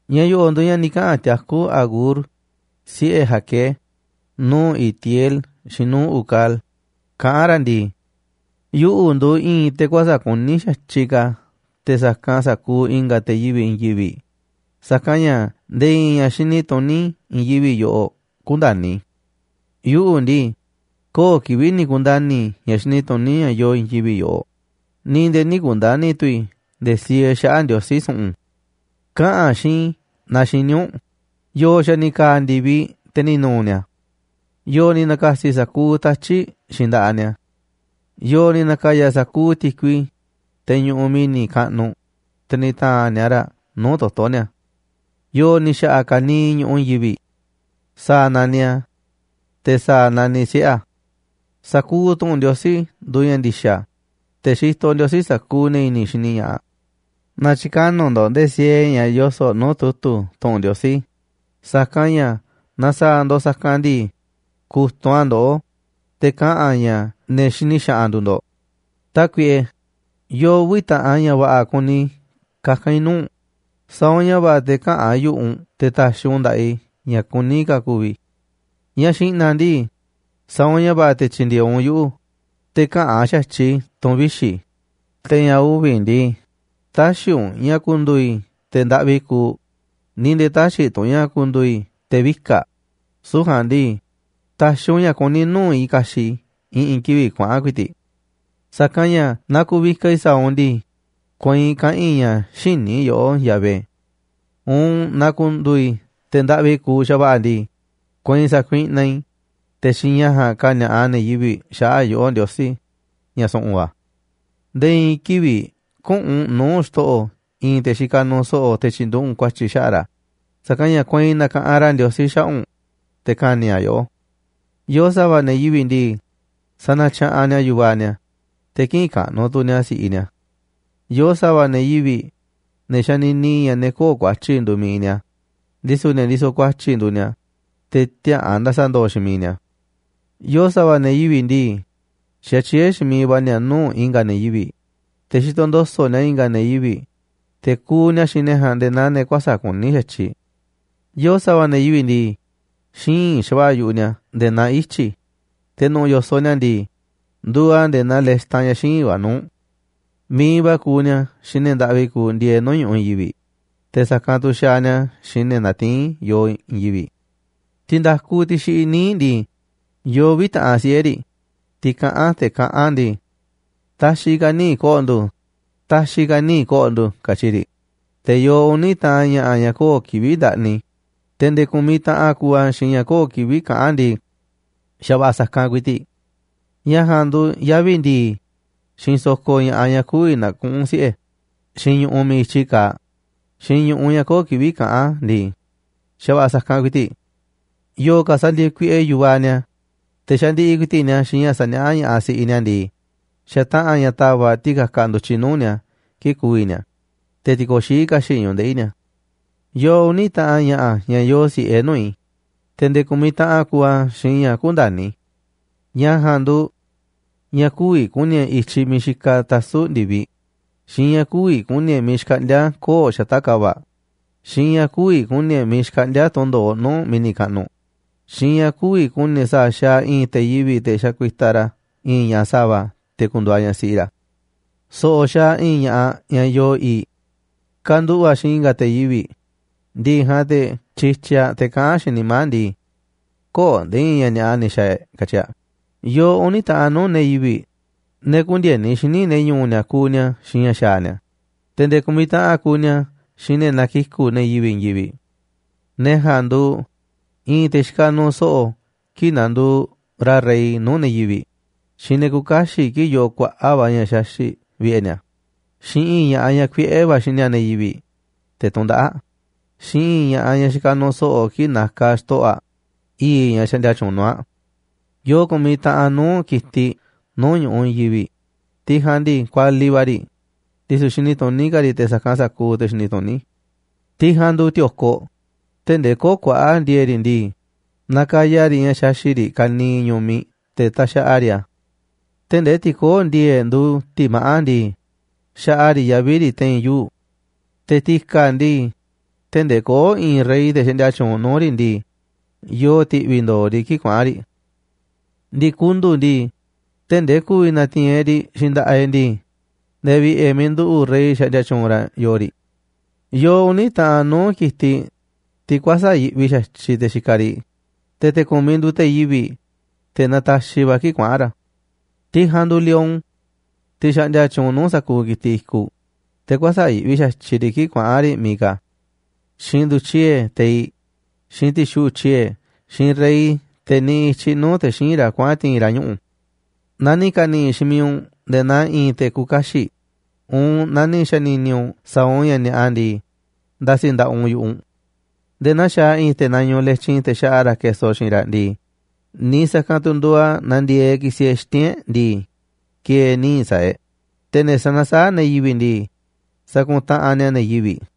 Ña̱ yo̱ꞌo̱ꞌ nduuꞌ ña̱ ni̱ kaꞌa̱n tiakú Agur, siꞌe̱ Jaqué, nuu̱ꞌ Itiel xiinꞌ nuu̱ꞌ Ucal kaꞌán ra̱ ndii: Yuꞌu̱ nduuꞌ i̱i̱n te̱ kuäsa̱ꞌ kuní xa̱tyiꞌ ka̱ te̱ sa̱kanꞌ sa̱kuuꞌ i̱nga̱ te̱ yivi̱ꞌ i̱i̱n yivi̱ꞌ, sa̱kanꞌ ña̱ nde̱e̱ i̱i̱n ña̱ xini tuní i̱i̱n yivi̱ꞌ yoꞌoꞌ kündani̱ i̱. Yuꞌu̱ ndii, köo̱ꞌ kivi̱ꞌ ni̱ ku̱nda̱ni̱ i̱ ña̱ xini tuní ña̱ yoo i̱i̱n yivi̱ꞌ yoꞌoꞌ, ni̱ nde̱e̱ nï̱ ku̱nda̱ni̱ tu̱ i̱ nde̱e̱ siee xaꞌa̱ꞌ Ndiosí su̱ꞌu̱n. Kaꞌa̱n xiinꞌ i̱ naaꞌ xiní u̱nꞌ. ¿Yo̱o̱ xa̱ ni̱ ka̱a̱ ndi̱viꞌ te̱ ni̱ nu̱u̱ ni̱a̱? ¿Yo̱o̱ ni̱ na̱ka̱si̱ sa̱kuuꞌ tatyi̱ꞌ xiinꞌ nda̱ꞌaꞌ ni̱a̱? ¿Yo̱o̱ ni̱ na̱ka̱ya̱ sa̱kuuꞌ ti̱kui, teꞌ ñuꞌuꞌ mi̱ni̱ kaꞌnuꞌ, te̱ ni̱ ta̱a̱nꞌ ni̱a̱ raꞌ nuu̱ꞌ toto̱ ni̱a̱? ¿Yo̱o̱ ni̱ xa̱ꞌa̱ ka̱niiꞌ ñu̱ꞌuꞌ i̱i̱n yivi̱ꞌ? ¿Sa̱a̱ naniꞌ a̱? Te̱, ¿sa̱a̱ naniꞌ siꞌe̱ a̱? Sa̱kuuꞌ tu̱ꞌu̱n Ndiosí nduuꞌ ña̱ ndi̱xa̱, te̱ xitoꞌ Ndiosí sa̱kuuꞌ ne̱ i̱ni̱ xini ña̱ꞌaꞌ. Nä̱tyi̱ka̱nuꞌ ndo̱ꞌ nde̱e̱ siee ña̱ yoso̱ꞌ nuu̱ꞌ tu̱tu̱ tu̱ꞌu̱n Ndiosí, sa̱kanꞌ ña̱ naaꞌ sa̱a̱ ndo̱ꞌ sa̱kanꞌ ndii, ku̱tunꞌ a̱ ndoꞌó, te̱ kaꞌa̱n a̱ ña̱ ne̱ xini xaꞌanꞌ nduuꞌ ndo̱ꞌ. Tákuiꞌe, yoo uvi̱ taꞌan ña̱ va̱ꞌa̱ kuni kaka̱n i̱ nuu̱ꞌ u̱nꞌ, sa̱a̱ u̱nꞌ ña̱ va̱ꞌa̱ te̱ käꞌa̱n yu̱ꞌuꞌ u̱nꞌ te̱ ta̱xi̱ u̱nꞌ nda̱ꞌaꞌ i̱ ña̱ kuní ka̱ ku̱vi̱ i̱. Ña̱ xi̱ꞌna̱ ndii, sa̱a̱ u̱nꞌ ña̱ va̱ꞌa̱ te̱ tyi̱ndi̱e̱eꞌ u̱nꞌ yuꞌu̱ te̱ käꞌa̱n xa̱tyiꞌ i̱ tu̱ꞌu̱n vixi̱, te̱ ña̱ uvi̱ ndii, tä̱xi̱ u̱nꞌ ña̱ ku̱ndu̱u̱ i̱ te̱ ndaꞌvi kuuꞌ, ni̱ nde̱e̱ tä̱xi̱ tu̱ u̱nꞌ ña̱ ku̱ndu̱u̱ i̱ te̱ vika̱ꞌ, süu̱ꞌ ja̱a̱nꞌ ndii, ta̱xi̱ u̱nꞌ ña̱ kuní nuu̱ꞌ i̱ ka̱xi̱ꞌ i̱ i̱ꞌi̱n kivi̱ꞌ kuaꞌa̱n ku̱i̱ti̱ꞌ. Sa̱kanꞌ ña̱ naaꞌ ku̱vikaꞌ i̱ sa̱a̱ u̱nꞌ ndii, kueinꞌ kaꞌa̱n i̱ ña̱ xïní i̱ yoꞌó, Yahvé. Uun naaꞌ ku̱ndu̱u̱ i̱ te̱ ndaꞌvi kuuꞌ xa̱va̱ꞌa̱ ndii, kueinꞌ sa̱kuiꞌnaꞌ i̱, te̱ xiinꞌ ña̱ ja̱a̱nꞌ ka̱ni̱a̱ꞌaꞌ ne̱ yivi̱ꞌ xaꞌa̱ꞌ yoꞌó, Ndiosí, ña̱ su̱ꞌu̱n va̱. Nde̱e̱ i̱i̱n kivi̱ꞌ küꞌu̱n u̱nꞌ nuu̱ꞌ xto̱ꞌo̱ i̱i̱n te̱ xikaꞌ nuuꞌ so̱ꞌo̱ te̱ tyi̱nduꞌu̱ꞌ u̱nꞌ ku̱a̱tyi̱ xaꞌa̱ꞌ ra̱, sa̱kanꞌ ña̱ kueinꞌ na̱ka̱ꞌanꞌ ra̱ Ndiosí xaꞌa̱ꞌ u̱nꞌ, te̱ ka̱ni̱ a̱ yoꞌó. Yoo sa̱va̱ ne̱ yivi̱ꞌ ndii, sanatyaꞌanꞌ ni̱a̱ yu̱vaꞌ ni̱a̱, te̱ kïꞌinꞌ kaꞌnuꞌ tu̱ ni̱a̱ si̱ꞌiꞌ ni̱a̱. Yoo sa̱va̱ ne̱ yivi̱ꞌ, ne̱ xanini ña̱ ne̱ köo̱ꞌ ku̱a̱tyi̱ nduuꞌ mi̱iꞌ ni̱a̱, ndisu̱ ne̱ ndisoꞌ ku̱a̱tyi̱ nduuꞌ ni̱a̱, te̱ tiäa̱ꞌan nda̱sa̱ndo̱o̱ xiinꞌ miiꞌ ni̱a̱. Yoo sa̱va̱ ne̱ yivi̱ꞌ ndii, xatyié xiinꞌ miiꞌ va̱ ni̱a̱ nuu̱ꞌ i̱nga̱ ne̱ yivi̱ꞌ, te̱ xitoꞌ ndo̱so̱ꞌ ni̱a̱ i̱nga̱ ne̱ yivi̱ꞌ, te̱ kuuꞌ ni̱a̱ xiinꞌ ne̱ ja̱a̱nꞌ nde̱e̱ naa ne̱ kuäsa̱ꞌ kuní xa̱tyiꞌ. Yo̱o̱ sa̱va̱ ne̱ yivi̱ꞌ ndii, xíinꞌ xa̱va̱ꞌa̱ yu̱ꞌuꞌ ni̱a̱ nde̱e̱ naa ityi̱, te̱ nu̱ꞌu̱ yo̱soꞌ ni̱a̱ ndii, nduuꞌ a̱ nde̱e̱ naa lextan ña̱ xíinꞌ va̱ nuu̱ꞌ. Mi̱iꞌ va̱ kuuꞌ ni̱a̱ xiinꞌ ne̱ ndaꞌvi kuuꞌ ndieeꞌ nuu̱ꞌ ñu̱ꞌuꞌ i̱i̱n yivi̱ꞌ, te̱ sa̱kanꞌ tu xaaꞌ ni̱a̱ xiinꞌ ne̱ natiín yoo i̱i̱n yivi̱ꞌ. Ti̱nda̱kuꞌ, tiꞌ xiꞌiꞌ níiꞌ ndii, yoo uvi̱ taꞌan siꞌe̱ riꞌ, tiꞌ kaꞌán, te̱ kaꞌán ndii: “Ta̱xi̱ ka̱ níiꞌ ko̱ꞌo̱ ndu̱, ta̱xi̱ ka̱ níiꞌ ko̱ꞌo̱ ndu̱”, katyi riꞌ. Te̱ yoo uni̱ taꞌan ña̱ꞌa̱ ña̱ köo̱ꞌ kivi̱ꞌ ndaꞌni, te̱ nde̱e̱ ku̱miꞌ taꞌan kuuꞌ a̱ xiinꞌ ña̱ köo̱ꞌ kivi̱ꞌ kaꞌán ndii: “Xa̱va̱ꞌa̱ sa̱kanꞌ ku̱i̱ti̱ꞌ.” Ña̱ ja̱a̱nꞌ nduuꞌ yavi̱ ndi̱i̱, xiinꞌ sokoꞌ ña̱ꞌaꞌ ñaꞌ kü̱vi̱ na̱kuꞌu̱n siꞌe̱, xiinꞌ ñu̱ꞌuꞌ miiꞌ i̱tyi kaaꞌ, xiinꞌ ñuꞌu̱ ña̱ köo̱ꞌ kivi̱ꞌ kaꞌán ndii: “Xa̱va̱ꞌa̱ sa̱kanꞌ ku̱i̱ti̱.” Yo̱o̱ ka̱ sandieeꞌ kuiꞌe yu̱vaꞌ ni̱a̱, te̱ xandiꞌiꞌ ku̱i̱ti̱ꞌ ni̱a̱ xiinꞌ ña̱ saniaá ña̱ꞌaꞌ si̱ꞌiꞌ ni̱a̱ ndii, xataꞌa̱n ña̱ ta̱va̱ꞌ ti̱ka̱kaꞌ ndu̱tyiꞌ nuu̱ꞌ ni̱a̱ kii̱ꞌ ku̱vi̱ ni̱a̱, te̱ ti̱ko̱xií ka̱xi̱ꞌ ñu̱ꞌuꞌ ndeꞌi̱ ni̱a̱. Yoo uni̱ taꞌan ña̱ꞌa̱ ña̱ yoo si̱ꞌe nuu̱ꞌ i̱, te̱ nde̱e̱ ku̱miꞌ taꞌan kuuꞌ a̱ xiinꞌ ña̱ kündani̱ i̱. Ña̱ ja̱a̱nꞌ nduuꞌ ña̱ kü̱vi̱ ku̱ni̱ e̱ꞌ i̱tyiꞌ miiꞌ xikaꞌ tasu̱ꞌ ndi̱viꞌ, xiinꞌ ña̱ kü̱vi̱ ku̱ni̱ e̱ꞌ miiꞌ xkaꞌndíá koo̱ꞌ xata̱ꞌ ka̱va̱ꞌ, xiinꞌ ña̱ kü̱vi̱ ku̱ni̱ e̱ꞌ miiꞌ xkaꞌndíá tundo̱oꞌ nuu̱ꞌ mi̱ni̱ kaꞌnuꞌ, xiinꞌ ña̱ kü̱vi̱ ku̱ni̱ e̱ꞌ sa̱a̱ xaaꞌ i̱i̱n te̱ yivi̱ꞌ te̱ xakuitaꞌ ra̱ i̱i̱n ñaꞌ sa̱va̱ te̱ ku̱ndu̱u̱ aꞌ ñaꞌ siꞌi ra̱. So̱ꞌo̱ xaaꞌ i̱i̱n ña̱ꞌaꞌ ñaꞌ yoo i̱i̱ꞌ: Kanduꞌu̱ꞌ aꞌ xiinꞌ i̱nga̱ te̱ yivi̱ꞌ, ndi̱ꞌi̱ ja̱a̱nꞌ te̱ tyityiꞌ aꞌ, te̱ kaꞌán aꞌ xiinꞌ nimá aꞌ ndii: “Köo̱ꞌ nde̱e̱ i̱i̱n ña̱ ni̱a̱ꞌa ni̱ xa̱a̱ e̱ꞌ”, katyi aꞌ. Yoo uni̱ taꞌan nuu̱ꞌ ne̱ yivi̱ꞌ, ne̱ kündieni xíniꞌ ne̱ ñu̱u̱ ni̱a̱ kuuꞌ xiinꞌ ña̱ xaaꞌ ni̱a̱, te̱ nde̱e̱ ku̱miꞌ taꞌan kuuꞌ ni̱a̱ xiinꞌ ne̱ nakiku̱ꞌ ne̱ yivi̱ꞌ i̱i̱n yivi̱ꞌ. Ne̱ ja̱a̱nꞌ nduuꞌ i̱i̱n te̱ xikaꞌ nuuꞌ so̱ꞌo̱ kii̱ꞌ nanduuꞌ ra̱ rey nuu̱ꞌ ne̱ yivi̱ꞌ, xiinꞌ ne̱ küuꞌ kaxiꞌ kii̱ꞌ yoo kuaꞌa̱ꞌ va̱ ña̱ xaxi̱ꞌ vi̱ꞌe̱ ni̱a̱, xiinꞌ i̱i̱n ña̱ꞌaꞌ, ñaꞌ kuiꞌe̱ va̱ xini ne̱ yivi̱ꞌ, te̱ tundaꞌáꞌ aꞌ, xiinꞌ i̱i̱n ñaꞌ xikaꞌ nuuꞌ so̱ꞌo̱ kii̱ꞌ nakaꞌ aꞌ xto̱ꞌo̱ aꞌ i̱i̱ꞌ ñaꞌ xaꞌndia tyuunꞌ nuu̱ꞌ aꞌ. Yoo ku̱miꞌ taꞌan nuu̱ꞌ ki̱tiꞌ nuu̱ꞌ ñu̱ꞌuꞌ i̱i̱n yivi̱ꞌ, tiꞌ ja̱a̱nꞌ ndii, kualiꞌ va̱ riꞌ, ndisu̱ xini tuní ka̱ riꞌ te̱ sa̱kanꞌ sa̱kuuꞌ ne̱ xini tuní. Tiꞌ ja̱a̱nꞌ nduuꞌ ti̱o̱koꞌ, tee̱ꞌ ndee köo̱ꞌ kuaꞌa̱ꞌ ndi̱e̱e̱ꞌ riꞌ ndii, nakaya riꞌ ña̱ xaxi̱ꞌ riꞌ ka̱niiꞌ ñu̱miꞌ te̱ taxaꞌa riꞌ a̱. Tee̱ꞌ ndee tiꞌ köo̱ꞌ ndi̱e̱e̱ꞌ nduuꞌ ti̱maꞌá ndii, xaꞌa riꞌ yavi̱ riꞌ te̱i̱n yuu̱ꞌ. Te̱ ti̱ka̱ ndii, tee̱ꞌ ndee köo̱ꞌ i̱i̱n rey, te̱ xaꞌndia tyuunꞌ nuu̱ꞌ riꞌ ndii, yoo ti̱ꞌvi̱ ndo̱o̱ riꞌ kii̱ꞌ kuaꞌa̱n riꞌ. Ndi̱kundu̱ꞌ ndii, tee̱ꞌ ndee ku̱vi̱ na̱ti̱i̱n e̱ꞌ riꞌ xiinꞌ nda̱ꞌaꞌ e̱ꞌ ndii, nde̱e̱ vi̱ꞌe̱ miiꞌ nduꞌu̱ꞌ rey xaꞌndia tyuunꞌ ra̱ yoo riꞌ. Yoo uni̱ taꞌan nuu̱ꞌ ki̱tiꞌ, tiꞌ kuäsa̱ꞌ yiꞌvi xa̱tyiꞌ te̱ xikaꞌ riꞌ, te̱ te̱ ku̱miꞌ nduuꞌ te̱ yivi̱ꞌ, te̱ nataxiꞌ va̱ kii̱ꞌ kuaꞌa̱n ra̱. Tiꞌ ja̱a̱nꞌ nduuꞌ lion, tiꞌ xaꞌndia tyuunꞌ nuu̱ꞌ sa̱kuuꞌ ki̱tiꞌ i̱kuꞌ, te̱ kuäsa̱ꞌ yiꞌvi xa̱tyiꞌ riꞌ kii̱ꞌ kuaꞌa̱n riꞌ miiꞌ ka̱. Xiinꞌ ndu̱tyie̱ teiꞌ, xiinꞌ ti̱xuꞌu̱ꞌ tyie̱, xiinꞌ rey, te̱ niꞌiꞌ i̱tyiꞌ nuu̱ꞌ te̱ xíinꞌ ra̱ kuaꞌa̱n ti̱i̱n ra̱ ñuꞌu̱. Naaꞌ ni̱ ka̱ni̱ꞌi̱ xiinꞌ miiꞌ u̱nꞌ nde̱e̱ naa i̱i̱n te̱ küuꞌ kaxiꞌ uun naa ni̱ xa̱ni̱ni̱ u̱nꞌ sa̱a̱ u̱nꞌ ña̱ ni̱a̱ꞌa ndii, nda̱si̱ nda̱ꞌaꞌ u̱nꞌ yu̱ꞌuꞌ u̱nꞌ. Nde̱e̱ naa xaaꞌ i̱i̱n te̱ nañuuꞌ letyin te̱ xaꞌa ra̱ keso xiinꞌ raꞌ ndii, niiꞌ sa̱kanꞌ tu̱ nduuꞌ a̱ naaꞌ ndi̱e̱eꞌ ki̱si̱ e̱ꞌ xiti̱nꞌ e̱ꞌ ndii, ki̱e̱e̱ níiꞌ sa̱a̱ e̱ꞌ, te̱ ne̱ sanasaáꞌ ne̱ yivi̱ꞌ ndii, sakuntaꞌanꞌ ni̱a̱ ne̱ yivi̱ꞌ.